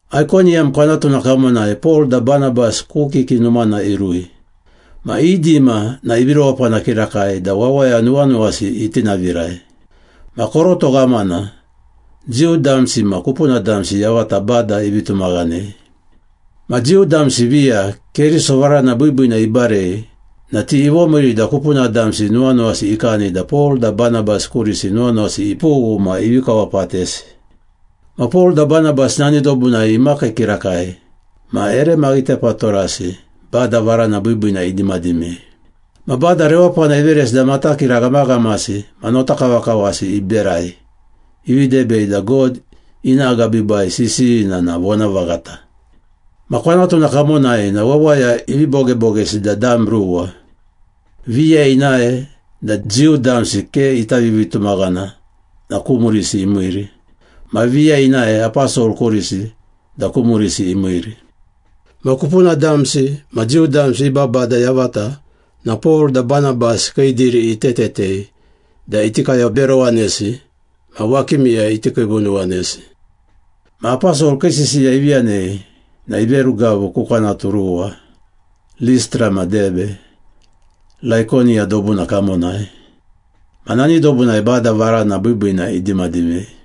Aikoniyam kwanatuna kamonai Pol da Banabas ku kiki numana irui. Ma i dima na ivi rewapana kirakai da wawaya nuwanuwasi itinavirai. Ma koroto ghamana, Jiu damsi ma kupuna damsi yavata Bada ivi tumaghanei. Ma Jiu damsi viya Keriso varana biibiina ibarei na ti ivomiiri da kupuna damsi nuwanuwasi ikani da Pol da Banabas kurisi nuwanuwasi ipughu ma ivi kawapatesi. Ma Pol da Banabas nani dobunai imakii kirakai ma ere maghitepatorasi Bada varana biibiina idimadimei. Ma Bada rewapana iveresi da matakira ghamaghamasi ma notakavakavasi iberai, ivi debei da God ina agabiibai sisiyina na vonavaghata. Ma kwanatuna kamonai na wawaya ivi bogebogesi da dam ruwa. Viya inae da Jiu damsi ke ita vivitumaghana na ku murisi imiiri. Ma viya inae aposol kurisi da ku murisi imiiri. Ma kupuna damsi ma Jiu damsi i babada yavata na Pol da Banabas kii diri itetetei da iti kayoberowanesi ma wakimiyai iti kiivunuwanesi. Ma aposol kii sisiya ivi yanei na iverugavu ku kwanatu ruwa, Listra ma Debe, Laikoniya dobuna kamonai. Ma nani dobunai Bada varana biibiina idimadimei.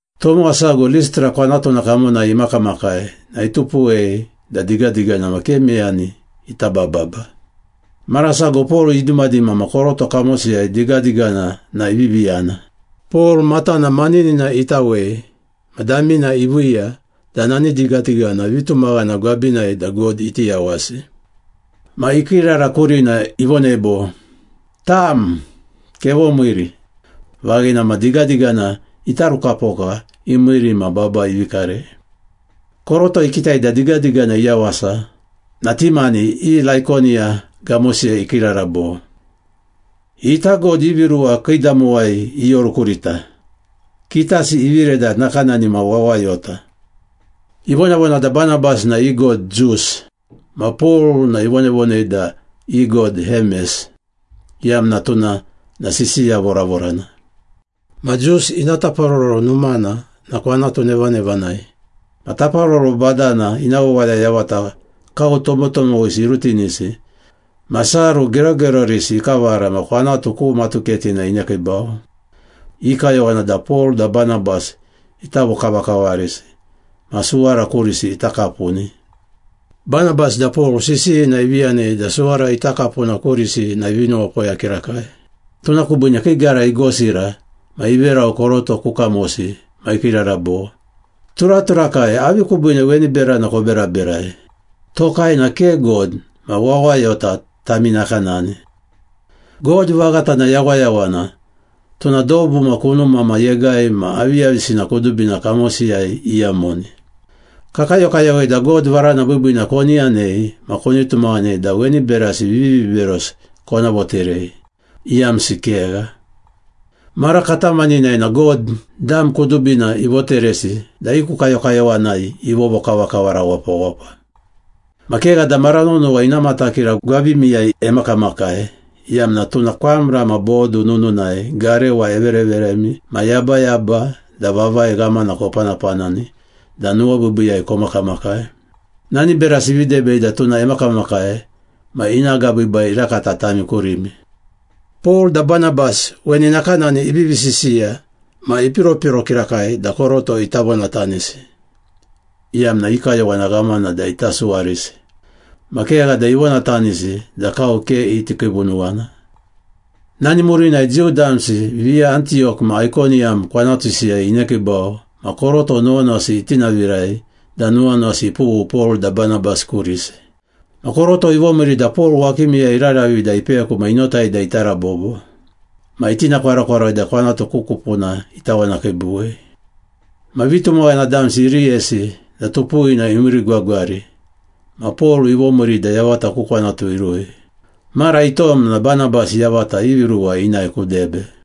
Tomowa sago Listra kwanatuna kamonai imakamakai na itupuwei da digadigana ma ke meyani ita bababa. Mara sago Pol idimadima ma koroto kamosiyai digadigana na ivivi yana. Pol matana maninina itawei ma damina iviiya da nani digadigana vitumaghana gwabinai da God iti yawasi. Ma ikiirara kurina, ivonei bo, “Tam, kevomiiri!” Vaghina ma digadigana itarukapoka imiiri ma baba ivi karei. Koroto ikitai da digadigana iyawasa na ti mani i Laikoniya gamosiyai ikiirara bo, “Ita god ivi ruwa kiidamowai ioru kurita, kitasi ivire da nakanani ma wawayota!” Ivonavona da Banabas na i god Zus ma Pol na ivonavonei da i god Hemes, iyamna tuna na sisiya voravorana. Ma Zus ina taparoro numana na kwanatu nevanevanai. Ma taparoro badana ina wawaya yavata kau tomotomowisi irutinisi ma saru gerogerorisi ikavara ma kwanatu ku matuketina inekiibau. I kayowana da Pol da Banabas ita vokavakavarisi ma suwara kurisi ita kapuni. Banabas da Pol sisiyina ivi yanei da suwara ita kapuna kurisi na ivi nuwapoya kirakai. Tuna kubiine kii gara igosira ma iverau koroto ku kamosi ma ikiirara bo, “Turaturakai, avi kubiine weni berana koberaberai? Tokai na ke god ma wawayota tami nakanani. God vaghata na yawayawana, tuna dobu ma kunuma ma yegai ma aviyavisina kudubina kamosiyai iyamoni. Kakayokayowei da God varana biibiina koni yanei ma koni tumaghanei da weni berasi viviberosi kona voterei. Iyamsi kegha! Mara katamaninai na God, dam kudubina ivoteresi da i ku kayokayowanai ivovokavakavara wapawapa. Ma kegha da mara nonowa ina matakira gwabimiyai emakamakai iyamna tuna kwamra ma bodu nununai garewa evereveremi ma yabayaba da vavai ghamana kopanapanani da nuwabiibiiyai komakamakai. Nani berasi ivi debei da tuna emakamakai ma ina agabiibai irakata tami kurimi.” Pol da Banabas weni nakanani ivivi sisiya ma ipiropiro kirakai da koroto ita vonatanisi, iyamna i kayowana ghamana da ita suwarisi. Ma kegha da ivonatanisi da kau ke iti kiivunuwana. Nani murinai Jiu damsi viya Antiyok ma Aikoniyam kwanatusiyai inekiibau ma koroto nuwanuwasi itinavirai da nuwanuwasi ipughu Pol da Banabas kurisi. Ma koroto ivomiiri da Pol wakimiyai iraravi da ipeku ma inotai da irabobo. Ma itinakwarokwaroi da kwanatu ku kupuna itawanakiibuwei. Ma vitumaghana damsi iriyesi da tupuwina imiirigwagwari ma Pol ivomiiri da yavata ku kwanatu irui. Mara itom na Banabas yavata ivi ruwa inae ku Debe.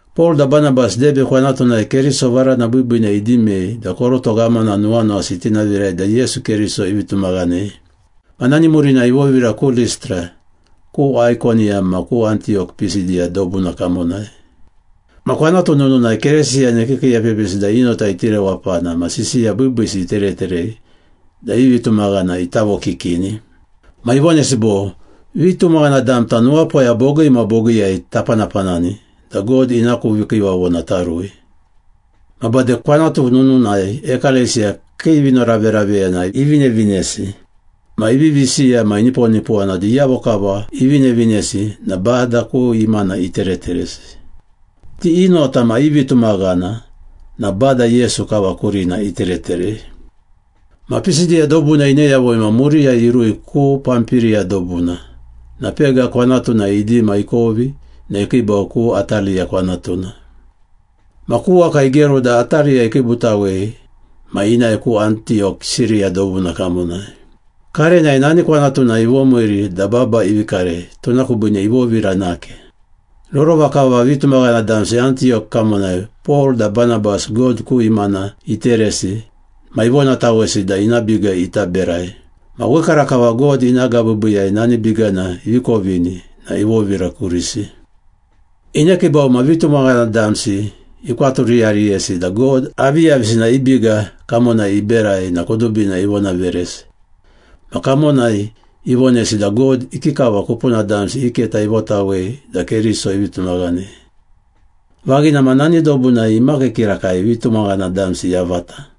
Pol da Banabas Debe kwanatunai Keriso varana biibiina idimei da koroto ghamana nuwanuwasi itinavirai da Yesu Keriso ivi tumaghanei. Ma nani murinai ivovira ku Listra, ku Aikoniyam ma ku Antiyok Pisidiya dobuna kamonai. Ma kwanatu nununai Keresiyana ikiikiiepepisi da i nota iti rewapana ma sisiya biibiisi itereterei da i vitumaghana ita vokikini. Ma ivonesi bo, “Vitumaghana damta nuwapoya bogii ma bogiiyai tapanapanani da God ina ku vikiivavona tarui.” Ma bade kwanatu nununai ekalesiya kii vinoraveraveyana ivinevinesi. Ma ivivi siya ma iniponipowana da iyavo kava ivinevinesi na Bada ku imana itereteresi. Ti i nota ma i vitumaghana na Bada Yesu kava kurina itereterei. Ma Pisidiya dobuna ine yavui na muriyai irui ku Pampiriya dobuna, na Pega kwanatunai idima ikovi na ikiibau ku Ataliya kwanatuna. Ma ku waka igeru da Ataliya ikiibutawei ma inae ku Antiyok Siriya dobuna kamonai. Karenai nani kwanatunai ivomiiri da baba ivi karei, tuna kubiine ivovira nake. Rorova kava vitumaghana damsi Antiyok kamonai Pol da Banabas God ku imana iteresi ma ivonatawesi da ina biga ita berai. Ma wekarakava God ina agabiibiiyai nani bigana ivi kovini na ivovira kurisi. Inekiibau ma vitumaghana damsi ikwaturiyariyesi da God aviyavisina i biga kamonai iberai na kudubina ivonaveresi. Ma kamonai ivonesi da God ikikava kupuna damsi i keta ivotawei da Keriso ivi tumaghanei. Vaghina ma nani dobunai imakii kirakai vitumaghana damsi yavata.